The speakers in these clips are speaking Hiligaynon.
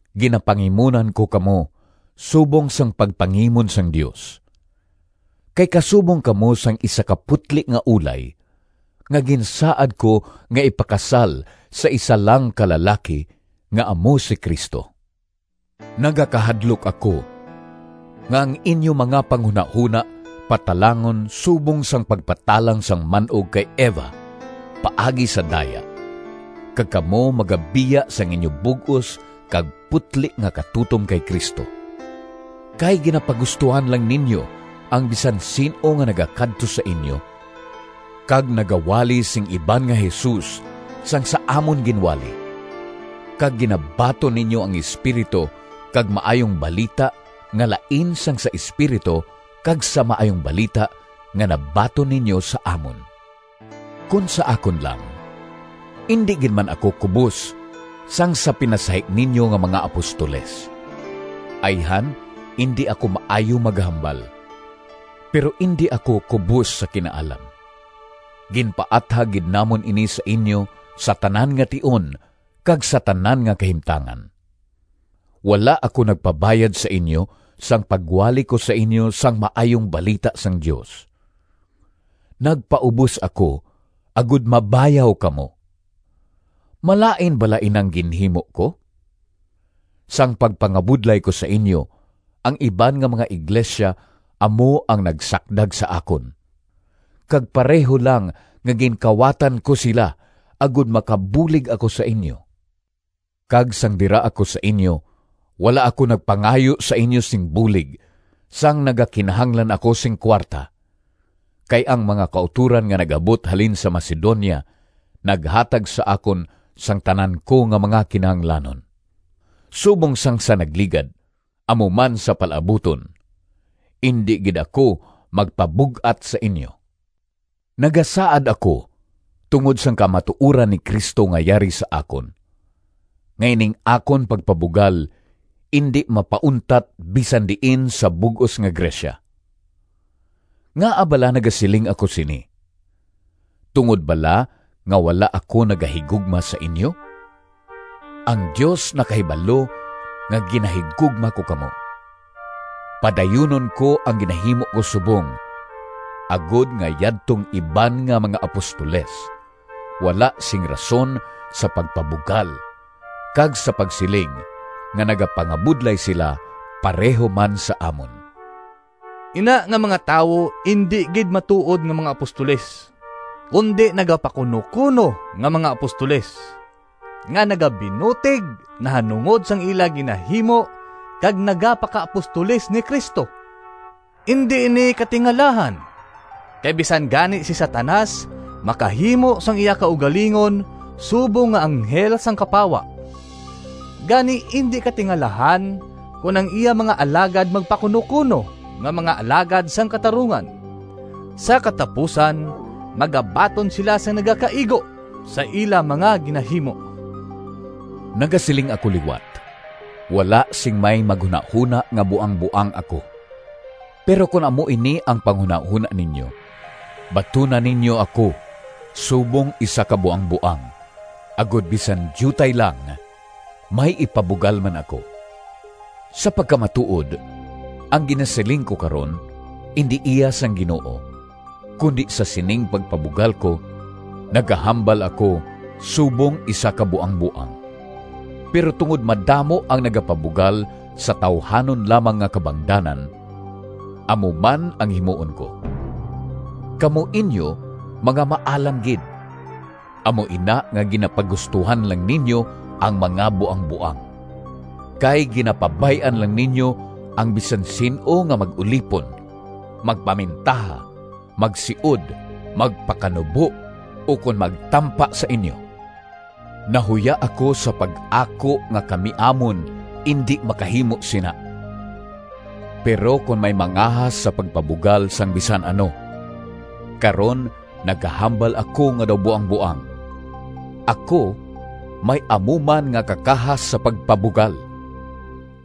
Ginapangimunan ko kamo subong sang pagpangimon sang Dios. Kay kasubong kamo sang isa ka putli nga ulay nga ginsaad ko nga ipakasal sa isa lang ka lalaki nga amo si Cristo. Nagakahadlok ako nga ang inyo mga panghunahona patalangon subong sang pagpatalang sang man-og kay Eva paagi sa daya, kag kamo magabiya sang inyo bug-os kag putli nga katutom kay Cristo. Kay ginapagustohan lang ninyo ang bisan sin-o nga nagakadto sa inyo kag nagawali sing iban nga Jesus sang sa amon ginwali. Kag ginabaton ninyo ang espiritu kag maayong balita nga lain sang sa Espiritu kag sa Maayong Balita nga nabaton ninyo sa amon. Kon sa akon lang, indi gid man ako kubos sang sa pinasahi ninyo nga mga “apostoles”! Ayhan indi ako maayo maghambal, pero indi ako kubos sa kinaalam. Ginpaathag gid namon ini sa inyo sa tanan nga tion kag sa tanan nga kahimtangan. Wala ako nagpabayad sa inyo sang pagwali ko sa inyo sang Maayong Balita sang Dios. Nagpaubos ako agod mabayaw kamo. Malain bala inang ginhimo ko? Sang pagpangabudlay ko sa inyo, ang iban nga mga iglesia amo ang nagsakdag sa akon, kag pareho lang nga ginkawatan ko sila agod makabulig ako sa inyo. Kag sang dira ako sa inyo wala ako nagpangayo sa inyo sing bulig sang nagakinahanglan ako sing kuwarta, kay ang mga kautoran nga nag-abot halin sa Macedonia naghatag sa akon sang tanan ko nga mga kinahanglanon. Subong sang sa nagligad, amo man sa palaabuton: indi gid ako magpabug-at sa inyo! Nagasaad ako tungod sang kamatuoran ni Cristo nga yari sa akon, nga ining akon pagpabugal indi mapauntat bisan diin sa bug-os nga Grecia. Ngaa bala nagasiling ako sini? Tungod bala nga wala ako nagahigugma sa inyo? Ang Dios nakahibalo nga ginahigugma ko kamo! Padayunon ko ang ginahimo ko subong, agod nga yadtong iban nga mga “apostoles” wala sing rason sa pagpabugal kag sa pagsiling nga nagapangabudlay sila pareho man sa amon. Ina nga mga tawo indi gid matuod nga mga apostoles, kundi nagapakunokuno nga mga apostoles, nga nagabinutig nahanungod sang ila ginahimo kag nagapakaapostoles ni Cristo. Indi ini katingalahan! Kay bisan gani si Satanas makahimo sang iya kaugalingon subong nga anghel sang kapawa! Gani indi katingalahan kon ang iya mga alagad magpakunokuno nga mga alagad sang katarungan. Sa katapusan magabaton sila sang nagakaigo sa ila mga ginahimo. Nagasiling ako liwat: wala sing may maghunahona nga buangboang ako. Pero kon amo ini ang panghunahona ninyo, batuna ninyo ako subong isa ka buangboang, agod bisan diutay lang may ipabugal man ako. Sa pagkamatuod ang ginasiling ko karon indi iya sang Ginoo, kundi sa sining pagpabugal ko, nagahambal ako subong isa ka buangboang. Pero tungod madamo ang nagapabugal sa tawuhanon lamang nga kabangdanan, amo man ang himuon ko. Kamo inyo mga maalam gid, amo ina nga ginapagustohan lang ninyo ang mga buangboang! Kay ginapabay-an lang ninyo ang bisan sin-o nga mag-ulipon, magpamintaha, magsiod, magpakanubo, ukon magtampa sa inyo. Nahuya ako sa pag-ako nga kami amon indi makahimo sina! Pero kon may mangahas sa pagpabugal sang bisan ano—karon nagahambal ako nga daw buangboang—ako may amo man nga kakahas sa pagpabugal.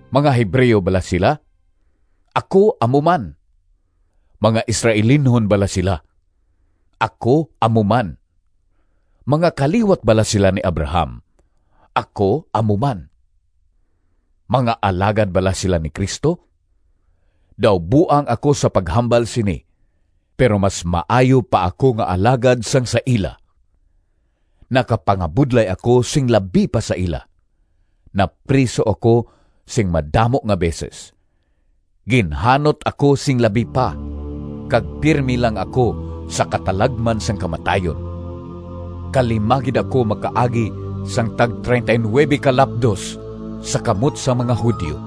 Mga Hebreo bala sila? Ako amo man. Mga Israelinhon bala sila? Ako amo man. Mga kaliwat bala sila ni Abraham? Ako amo man. Mga alagad bala sila ni Cristo? Daw buang ako sa paghambal sini, pero mas maayo pa ako nga alagad sang sa ila! Nakapangabudlay ako sing labi pa sa ila, napriso ako sing madamo nga beses, ginhanot ako sing labi pa, kag pirme lang ako sa katalagman sang kamatayon. Kalima gid ako makaagi sing tag-39 ka lapdos sa kamot sang mga Judio.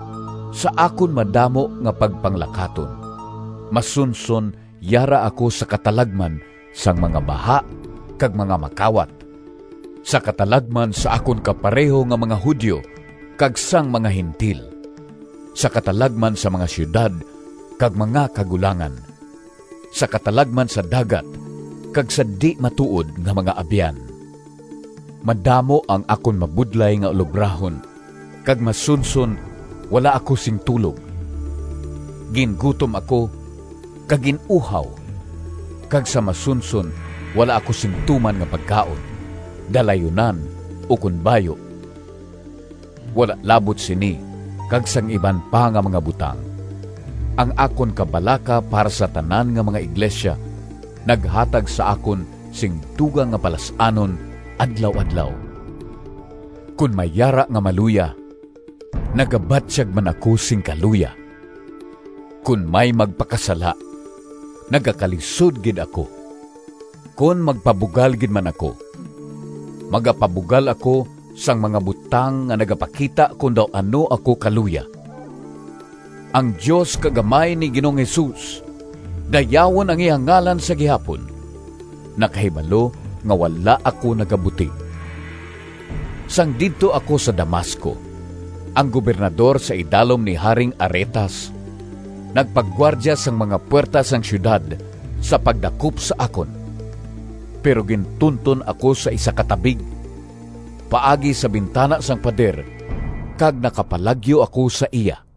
Sa akon madamo nga pagpanglakaton masunson yara ako sa katalagman sang mga baha kag mga makawat, sa katalagman sa akon kapareho nga mga Judio kag sang mga Gentil, sa katalagman sa mga siyudad kag mga kagulangan, sa katalagman sa dagat kag sa di-matuod nga mga abyan. Madamo ang akon mabudlay nga ulobrahon kag masunson wala ako sing tulog. Gingutom ako kag gin-uhaw kag sa masunson wala ako sing tuman nga pagkaon, dalayunan, ukon bayu. Wala labot sini kag sang iban pa nga mga butang, ang akon kabalaka para sa tanan nga mga iglesia naghatag sa akon sing dugang nga palas-anon adlaw-adlaw. Kon may yara nga maluya, nagabatyag man ako sing kaluya. Kon may magpakasala, nagakalisod gid ako. Kon magpabugal gid man ako, magapabugal ako sang mga butang nga nagapakita kon daw ano ako kaluya. Ang Dios kag Amay ni Ginoong Jesus—dayawon ang iya ngalan sa gihapon!—nakahibalo nga wala ako nagabutig. Sang didto ako sa Damasco, ang gobernador sa idalom ni Haring Aretas nagpagwardya sang mga puwerta sang siyudad sa pagdakop sa akon. Pero gintunton ako sa isa ka tabig, paagi sa bintana sang pader, kag nakapalagyo ako sa iya.